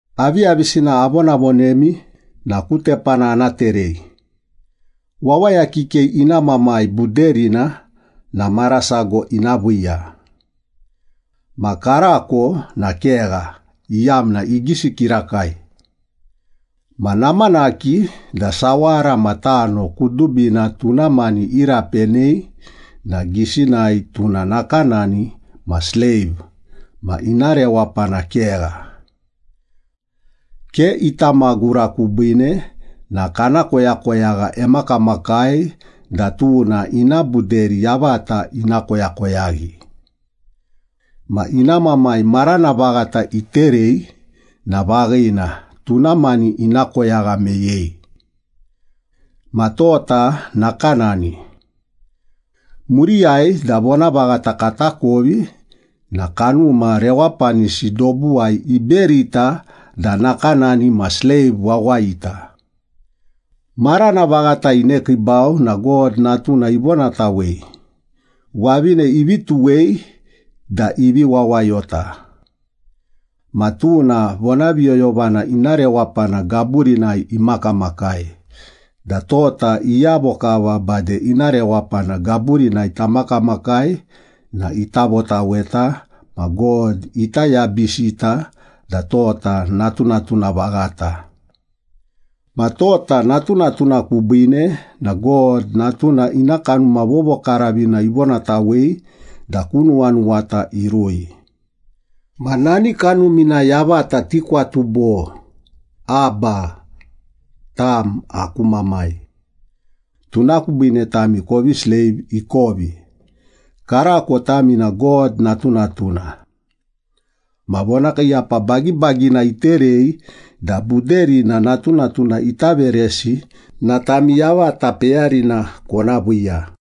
Aviyavisina avonavonemi na ku tepana ana terei. Wawaya kikei ina mamai buderina na mara sago ina viiya. Ma karako na kegha, iyamna igisi kirakai. Ma namanaki da sawara ma tano kudubina tuna mani irapenei na gisinai tuna nakanani ma sleiv ma ina rewapana kegha. Ke ita magura kubiine na kana koyakoyagha emakamakai da tuna ina buderi yavata ina koyakoyaghi. Ma ina mamai marana vaghata iterei na vaghina, tuna mani ina koyagha meyei. Ma tota nakanani. Muriyai da vonavaghata katakovi na kanuma rewapanisi dobuwai iberita da nakanani ma sleiv wawayita. Marana vaghata inekiibau na God Natuna ivonatawei, wavine ivi tuwei da ivi wawayota. Ma tuna vonaviyoyovana ina rewapana gaburinai imakamakai da tota iyavo kava bade ina rewapana gaburinai tamakamakai na ita votaweta, ma God ita yabisita da tota natunatuna vaghata. Ma tota natunatuna kubiine na God Natuna ina Kanuma Vovokaravina ivonatawei da ku nuwanuwata irui. Ma nani Kanumina yavata tikwatu bo, “Abba, tam aku Mamai.” Tuna kubiine tami kovi sleiv ikovi, karako tami na God natunatuna. Ma vonakiiyapa bagibagina iterei da buderina natunatuna ita veresi na tami yavata peyarina kona viiya.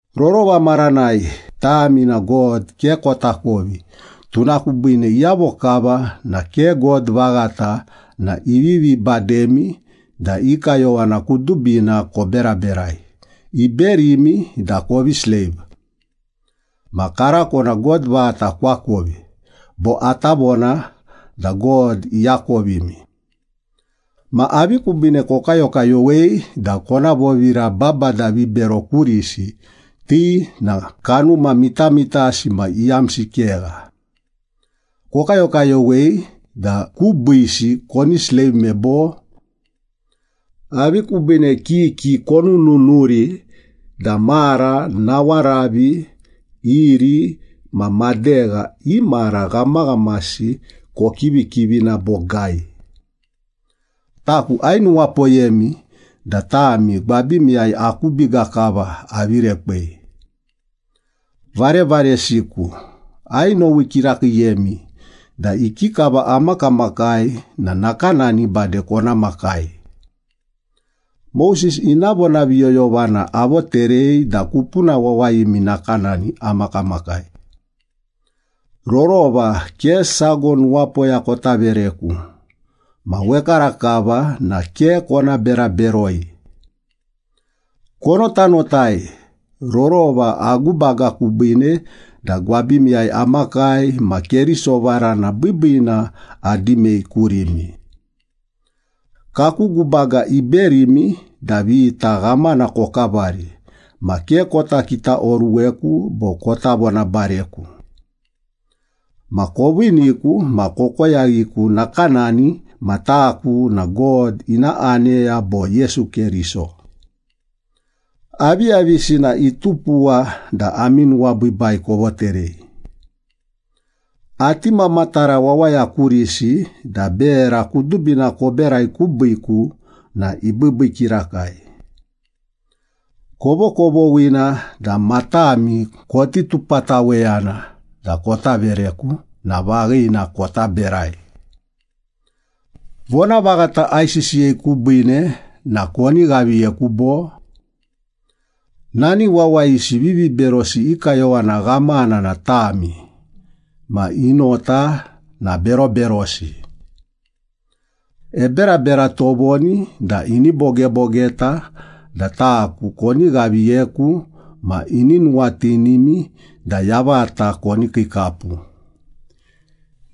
Rorova maranai tami na God ke kotakovi, tuna kubiine iyavo kava na ke god vaghata na ivivi bademi da i kayowana kudubina koberaberai, iberimi da kovi sleiv. Ma karako na God vaghata koakovi, bo ata vona da God iakovimi. Ma avi kubiine kokayokayowei da kona vovira babada vibero kurisi, ti na kanuma mitamitasi ma iyamsi kegha. Kokayokayowei da kubiisi koni sleivme, bo? Avi kubiine kiki konununuri da mara, nawaravi, iri ma madegha i mara ghamaghamasi kokivikivina bogai? Taku ainuwapoyemi da tami gwabimiyai aku biga kava avi rekwei. Varevaresiku, ainowi kirakiiyemi, da ikikava amakamakai na nakanani bade kona makai. Moses ina vonaviyoyovana avoterei da kupuna wawayimi nakanani amakamakai. Rorova ke sago nuwapoya kota vereku, ma wekarakava na ke kona bera beroi. Konotanotai, rorova agubaga kubiine da gwabimiyai amakai ma Keriso varana biibiina adimei kurimi. Kaku gubaga iberimi da vita ghamana kokavari, ma ke kota kitaoruweku bo kota vonabareku. Ma koviiniku ma kokoyaghiku nakanani ma taku na God ina aneya bo Yesu Keriso. Aviyavisina itupuwa da ami nuwabiibai kovoterei? Ati mamatara wawaya kurisi da bera kudubina koberai kubiiku na ibiibii kirakai. Kovokovoghina da matami koti tupataweyana da kota vereku na vaghina, kota berai. Vonavaghata aisisiyei kubiine na koni ghaviyeku bo? Nani wawayisi viviberosi i kayowana ghamana na tami, ma i nota na beroberosi. Eberabera tovoni da ini bogebogeta da taku koni ghaviyeku ma ini nuwatinimi da yavata koni kiikapu.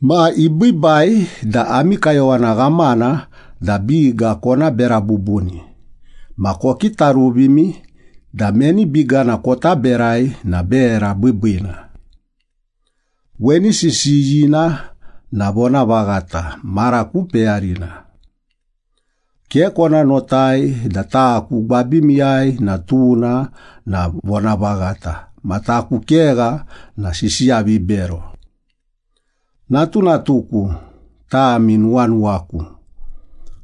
Ma ibiibai da ami kayowana ghamana da biga kona bera bubuni, ma kokitaruvimi da meni bigana kota berai na bera biibiina. Weni sisiyina na vonavaghata mara ku peyarina. Ke kona notai da taku gwabimiyai na tuna na vonavaghata ma taku kegha na sisiya vibero. Natunatuku, tami nuwanuwaku,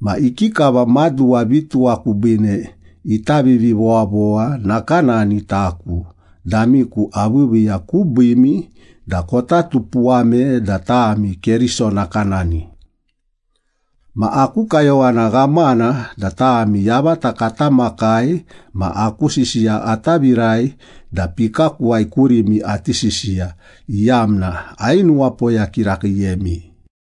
ma ikikava maduwa vituwa kubiine ita vivivowavowa, nakanani taku damiku aviiviiya kubiimi da kota tupuwame da tami Keriso nakanani. Ma aku kayowana ghamana da tami yavata kata makai ma aku sisiya ata virai da pikakuwai kurimi ati sisiya, iyamna ainuwapoya kirakiiyemi.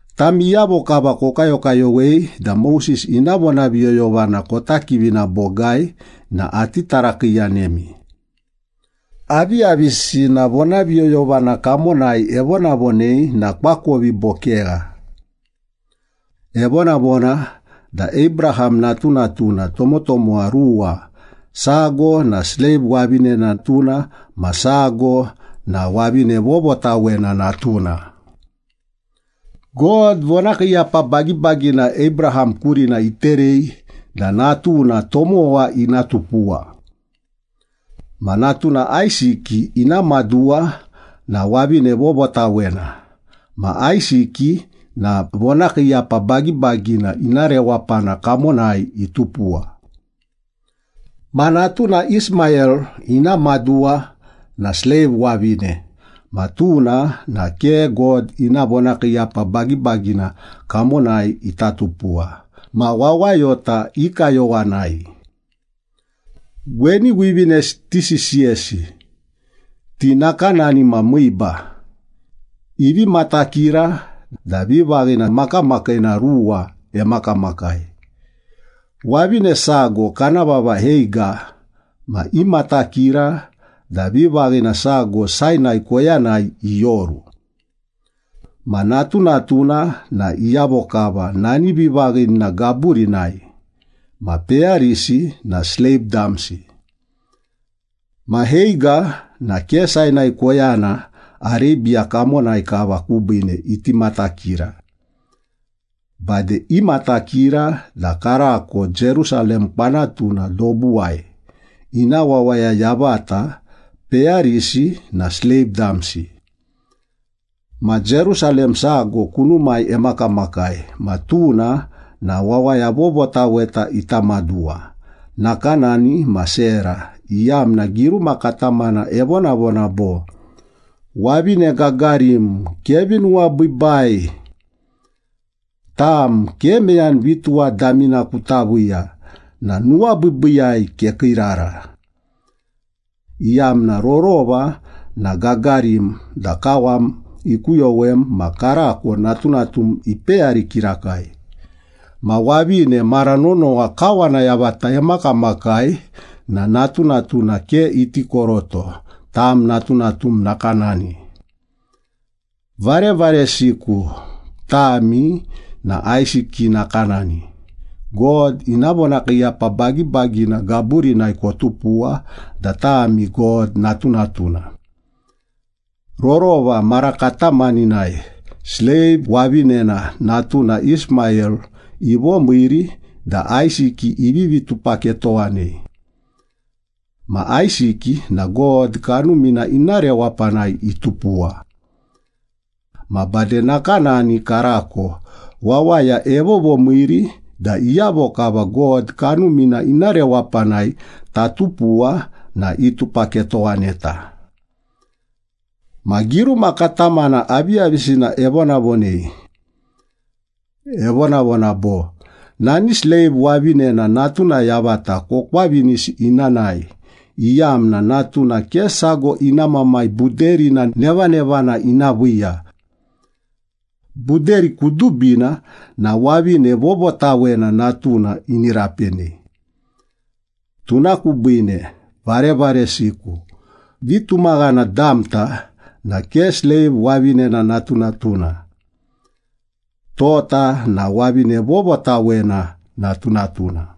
Tami iyavo kava kokayokayowei da Moses ina vonaviyoyovana kota kivina bogai na ati tarakiiyanemi. Aviyavisina vonaviyoyovana kamonai evonavonei na koakovi bo kegha? Evonavona da Abraham natunatuna tomotomowa ruwa, sago na sleiv wavine natuna ma sago na wavine vovotawena natuna. God vonakiiyapa bagibagina Abraham kurina iterei da natuna tomowa ina tupuwa. Ma natuna Aisiki ina maduwa na wavine vovotawena, ma Aisiki na vonakiiyapa bagibagina ina rewapana kamonai itupuwa. Ma natuna Ismayel ina maduwa na sleiv wavine ma tuna na ke God ina vonakiiyapa bagibagina kamonai ita tupuwa, ma wawayota i kayowanai. Weni wivinesi tisisiyesi. Ti nakanani ma miiba, ivi matakira da vivaghina makamakiina ruwa emakamakai. Wavine sago kana vava Heiga ma imatakira da vivaghina sago Sainai koyanai ioru. Ma natunatuna na iyavo kava nani vivaghinina gaburinai, ma peyarisi na sleiv damsi. Ma Heiga na ke Sainai koyana Arebiya kamonai kava kubiine iti matakira. Bade imatakira da karako Jerusalem kwanatuna dobuwai, ina wawaya yavata, peyarisi na sleiv damsi. Ma Jerusalem sago kunumai emakamakai ma tuna na wawaya vovotaweta ita maduwa, nakanani ma Sera, iyamna giruma katamana evonavona bo, “Wavine gagarim, kevi nuwabiibai! Tam ke meyani vituwa damina kuta viiya na nuwabiibiiyai kekiirara! Iyamna rorova na gagarim da kawam ikuyowem, ma karako natunatum ipeyari kirakai, Ma wavine mara nonowa kawana yavata emakamakai na natunatuna ke iti koroto, tam natunatum nakanani.” Varevaresiku, tami na Aisiki nakanani, God ina vonakiiyapa bagibagina gaburinai kotupuwa da tami God natunatuna. Rorova mara katamaninai sleiv wavinena natuna Ismayel ivomiiri da Aisiki ivivi tupaketowanei. Ma Aisiki na God Kanumina ina rewapanai itupuwa. Ma bade nakanani karako wawaya evovomiiri da iyavo kava God Kanumina ina rewapanai tatupuwa na itupaketowaneta. Ma giruma katamana, aviyavisina evonavonei? Evonavona bo, “Nani sleiv wavinena natuna yavata kokwavinisi ina nae, iyamna natuna ke sago ina mamai buderina nevanevana ina viiya. Buderi kudubina na wavine vovotawena natuna ini rapenei.” Tuna kubiine, varevaresiku, vitumaghana damta na ke sleiv wavinena natunatuna. Tota na wavine vovotawena natunatuna.